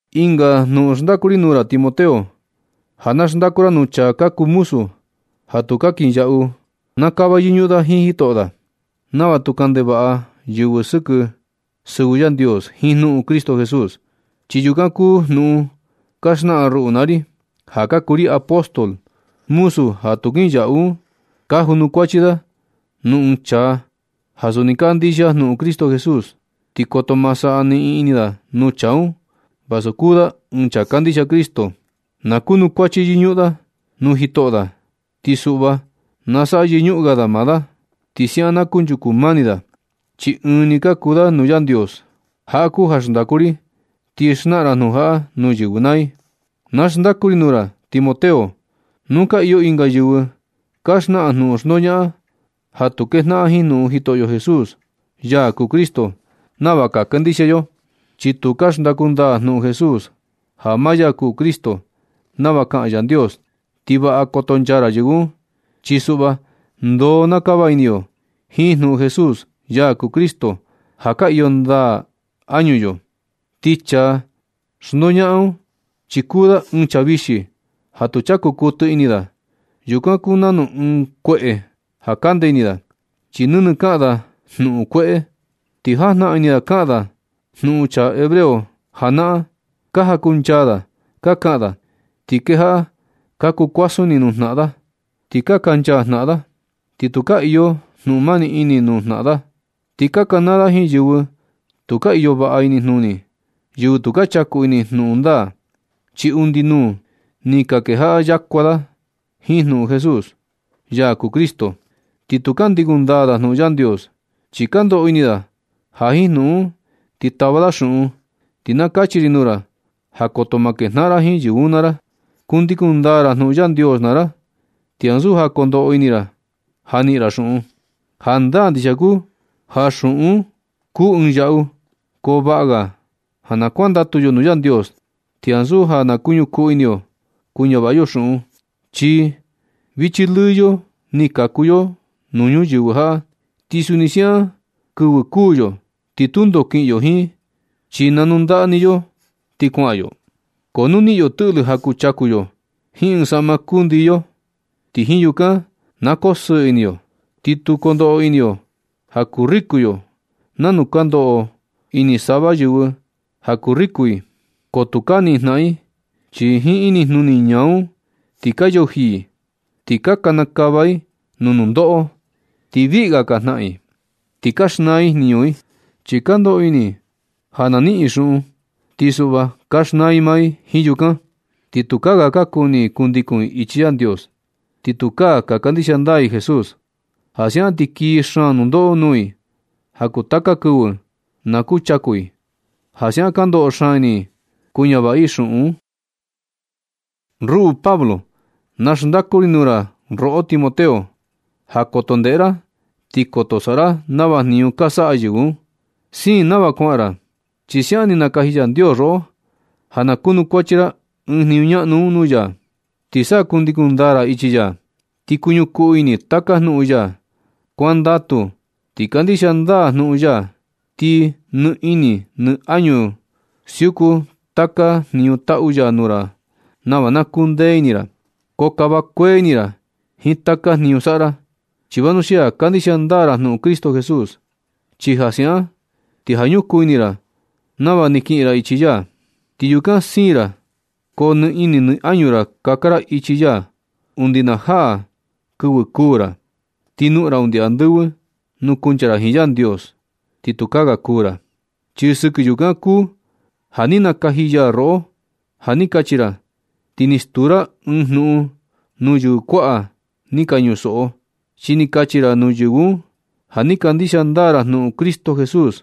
Ɨnga jnuꞌun xndaku ri nuu ra Timoteo, ja na xndaku ra nuu chaa ka kuu muzu ja tu ka kinyaꞌu. Na kava yɨñuꞌun da jiin jitoꞌo da nava tu kaꞌan ndevaꞌa yɨvɨ sɨkɨ sɨvɨ Yandios jiin jnuꞌun Cristo Jesús, chi yukan kuu jnuꞌun ka xnaꞌan ruꞌu naa ri, ja ka kuu ri apóstol. Muzu ja tu kinyaꞌu un, ka junukuachi da nuu ɨɨn chaa ja suni kandixia jnuꞌun Cristo Jesús, ti koto ma saꞌa niꞌin ini da nuu chaa un vasu kuu da ɨɨn chaa kandixia Cristo. Na kunukuachi yɨñuꞌun da nuu jitoꞌo da, ti suꞌva na saꞌa yɨñuꞌun ga da maa da. Ti siaꞌan na kunchuku mani da, chi ɨɨn ni ka kuu da nuu Yandios. Jaꞌa kuu ja xndaku ri, ti xnaꞌan ra jnuꞌun jaꞌa nuu yɨvɨ naa i. Na xndaku ri nuu ra Timoteo, nu ka iyo ɨnga yɨvɨ ka xnaꞌan jnuꞌun xndoñaꞌan ja tu kejnaꞌan jiin jnuꞌun Jitoꞌo Jesús, ya kuu Cristo, nava ka kandixia yo, chi tu xndaku ndaa da jnuꞌun Jesús ja maa ya kuu Cristo, nava kaꞌan Yandios. Ti vaꞌa kotonchaa ra yɨvɨ un, chi suꞌva ndoo na kava ini yo jiin jnuꞌun Jesús, ya kuu Cristo, ja ka iyo ndaa añu yo. Ti chaa xndoñaꞌan un, chi kuu da ɨɨn chaa vixi ja tu chaku kuɨtɨ ini da. Yukan kuu nanu ɨɨn kueꞌe ja kande ini da, chi nɨnɨ kaꞌan da jnuꞌun kueꞌe. Ti jajnaꞌan ini da kaꞌan da jnuꞌun chaa hebreo janaꞌan, ka jankuncha da ka kaꞌan da, ti kejaꞌa ka kuu kuasun ini nuu jnaꞌan da, ti ka kaꞌanchaa jnaꞌan da, ti tukaa iyo jnuꞌun mani ini nuu jnaꞌan da. Ti ka kanaa da jiin yɨvɨ tu ka iyo vaꞌa inijnuni, yɨvɨ tu ka chaku ini jnuꞌun ndaa, chi undi nuu ni ka kejaꞌa yakua da jiin jnuꞌun Jesús, ya kuu Cristo. Ti tu ka ndikun ndaa da jnuꞌun Yandios, chi ka ndoꞌo ini da ja jiin jnuꞌun un ti tava da xuꞌun. Ti na kachi ri nuu ra ja koto ma kejnaꞌan ra jiin yɨvɨ un naa ra. Kundikun ndaa ra jnuꞌun Yandios naa ra, ti ansu ja kondoꞌo ini ra ja niꞌin ra xuꞌun. Jandaa ndixia kuu ja xuꞌun un kuu ɨɨn yaꞌu, ko vaꞌa ga ja na kuandatu yo nuu Yandios ti ansu ja kuñukuu ini yo kuñavaꞌa yo xuꞌun. Chi vichi lɨɨ yo ni kaku yo nuu ñuyɨvɨ jaꞌa ti suni siaꞌan kɨvɨ kuū yo. Tu ndoo kiꞌin yo jiin chi nanundaꞌa ni yo ti kuaꞌan yo. Ko nu niꞌin yo tɨꞌlɨ ja kuchaku yo jiin ɨɨn saꞌma kundii yo, ti jiin yukan na koo sɨɨ ini yo. Ti tu kondoꞌo ini yo ja kuu riku yo nanu ka ndoꞌo ini sava yɨvɨ ja kuu riku i. Ko tu ka niꞌin jnaꞌan i, chi jiin inijnuni ñaa un ti ka yuji i, ti ka kanakava i nuu nundoꞌo, ti viꞌi ga ka jnaꞌan i, ti ka xnaa i jniñu i. Chi ja ka ndoꞌo ini i ja na niꞌin i xuꞌun, ti suꞌva ka xnaa i maa i jiin yukan, ti tukaa ga ka kuni i kundikun i ichi Yandios, ni tukaa ka kandixia ndaa i Jesús. Ja siaꞌan ti kii xaan nundoꞌo nuu i ja kuu taka ga kɨvɨ na kuchaku i ja siaꞌan ka ndoꞌo xaan ini i kuñavaꞌa i xuꞌun un. Ruꞌu Pablo, na xndaku ri nuu ra roꞌo Timoteo, ja koto ndeꞌe ra ti koto saꞌa ra nava jniñu ka saꞌa yɨvɨ un. Siin nava kuaꞌan ra chi siaꞌan ni nakaji Yandios roꞌo ja na kunukuachi ra ɨɨn jniñu ñaꞌnu un nuu ya, ti sa kundikun ndaa ra ichi ya, ti kuñukuu ini taka jnuꞌun ya. Kuandatu ti kandixia ndaa jnuꞌun ya, ti nɨ ini nɨ añu ra siuku taka jniñu taꞌu ya nuu ra nava na kundee ini ra. Ko kava kuee ini ra jiin taka jniñu saꞌa ra, chi vanuxia kandixia ndaa ra jnuꞌun Cristo Jesús. Chi ja siaꞌan ti ja ñukuu ini ra nava ni kiꞌin ra ichi ya, ti yukan siin ra ko nɨ ini nɨ añu ra kaka ra ichi ya undi na jaa kɨvɨ kuū ra, ti noꞌon ra undi andɨvɨ nuu kuncha ra jiin Yandios, ti tukaa ga kuū ra. Chi sɨkɨ yukan kuu ja ni nakaji ya roꞌo ja ni kachi ra, ti ni stuu ra ɨɨn jnuꞌun nuu yɨvɨ kuaꞌa ni ka ñusoꞌo. Chi ni kachi ra nuu yɨvɨ un ja ni kandixia ndaa ra jnuꞌun Cristo Jesús.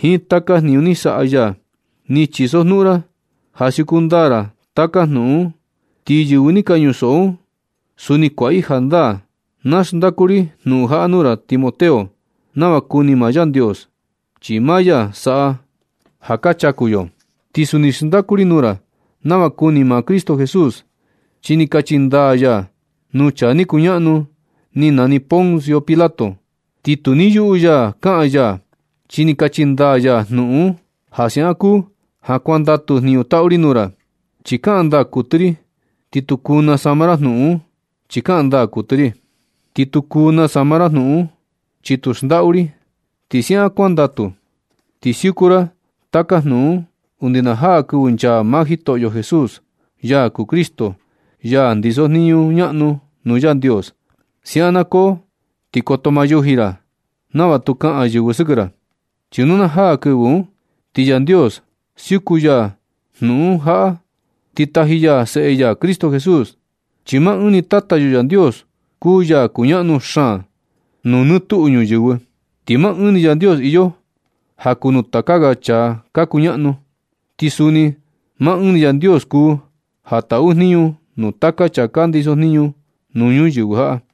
Jiin taka jniñu ni saꞌa ya, ni chisojnuꞌun ra ja siuku ndaa ra taka jnuꞌun un, ti yɨvɨ ni ka ñusoꞌo un, suni kuaꞌa i jandaa. Naxndaku ri jnuꞌun jaꞌa nuu ra Timoteo nava kuni maa Yandios, chi maa ya saꞌa ja ka chaku yo. Ti suni xndaku ri nuu ra nava kuni maa Cristo Jesús, chi ni kachi ndaa ya nuu chaa ni kuñaꞌnu ni nani Poncio Pilato, ti tu ni yuꞌu ya kaꞌan ya, chi ni kachi ndaa ya jnuꞌun un. Ja siaꞌan kuu ja kuandatu jniñu taꞌu ri nuu ra, chi kaꞌan ndaa kuɨtɨ ri, ti tu kuu nasama ra jnuꞌun un, chi kaꞌan ndaa kuɨtɨ ri, ti tu kuu nasama ra jnuꞌun un, chi tu xndaꞌu ri. Ti siaꞌan kuandatu, ti siuku ra taka jnuꞌun un undi na jaa kɨvɨ nchaa maa Jitoꞌo Jesús, ya kuu Cristo, ya ndiso jniñu ñaꞌnu nuu Yandios. Siaꞌan na koo ti koto ma yuji ra, nava tu kaꞌan yɨvɨ sɨkɨ ra. Chi nu na jaa kɨvɨ un ti Yandios siuku ya jnuꞌun jaꞌa, ti taji ya Seꞌe ya Cristo Jesús, chi maa ɨɨn ni Tata yo Yandios kuu ya kuñaꞌnu xaan nuu nɨ tuꞌu ñuyɨvɨ. Ti maa ɨɨn ni Yandios iyo ja kuu nuu taka ga chaa ka kuñaꞌnu. Ti suni maa ɨɨn ni Yandios kuu ja taꞌu jniñu nuu taka chaa ka ndiso jniñu nuu ñuyɨvɨ jaꞌa.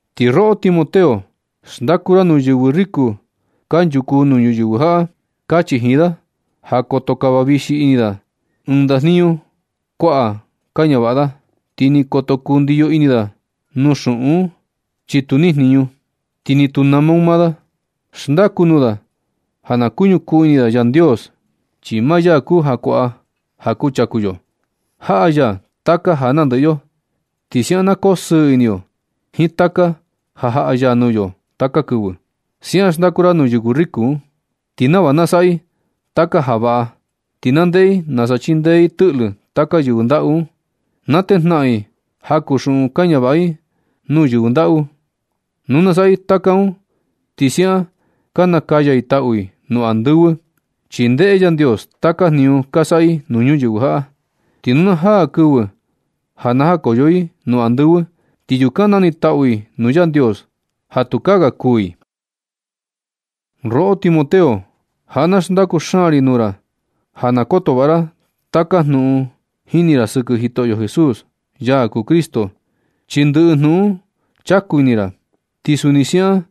Ti roꞌo Timoteo, xndaku ra nuu yɨvɨ riku kanchuku nuu ñuyɨvɨ jaꞌa. Kachi jiin da ja koto kava vixi ini da ɨɨn ndajniñu kuaꞌa ka ñavaꞌa da, ti ni koto kundiyo ini da nuu xuꞌun un, chi tu niꞌin jniñu, ti ni tu nama un maa da. Xndaku nuu da ja na kuñukuu ini da Yandios, chi maa ya kuu ja kuaꞌa ja kuchaku yo. Jaꞌa ya taka ja nandɨꞌɨ yo, ti siaꞌan na koo sɨɨ ini yo jiin taka ja jaꞌa ya nuu yo taka kɨvɨ. Siaꞌan xndaku ra nuu yɨvɨ riku un, ti nava na saꞌa i taka ja vaꞌa, ti na ndeꞌe i nasa chindee i tɨꞌlɨ taka yɨvɨ ndaꞌu un. Na tejnaꞌan i jaku xuꞌun ka ñavaꞌa i un nuu yɨvɨ ndaꞌu. Nu na saꞌa i taka un ti siaꞌan ka nakaya i taꞌu i nuu andɨvɨ, chi ndeꞌe Yandios taka jniñu ka saꞌa i nuu ñuyɨvɨ jaꞌa. Ti nu na jaa kɨvɨ ja najakoyo i nuu andɨvɨ, ti yukan nanitaꞌu i nuu Yandios ja tukaa ga kuū i. Roꞌo Timoteo, jaꞌa na xndaku xaan ri nuu ra ja na koto vaꞌa ra taka jnuꞌun jini ra sɨkɨ Jitoꞌo Jesús, ya kuu Cristo, chi ndɨꞌɨ jnuꞌun un chaku ini ra. Ti suni siaꞌan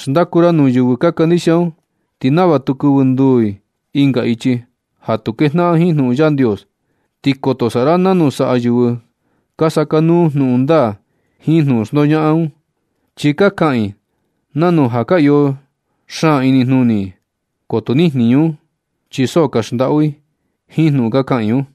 xndaku ra nuu yɨvɨ ka kandixia un ti nava tu kɨvɨ nduu i ɨnga ichi ja tu kejnaꞌan jiin jnuꞌun Yandios. Ti koto saꞌa ra nanu saꞌa yɨvɨ ka sakanuu jnuꞌun ndaa jiin jnuꞌun xndoñaꞌan un, chi ka kaꞌan i nanu ja ka iyo xaan inijnuni i, ko tu niꞌin jniñu un, chi so ka xndaꞌu i jiin jnuꞌun ka kaꞌan i un.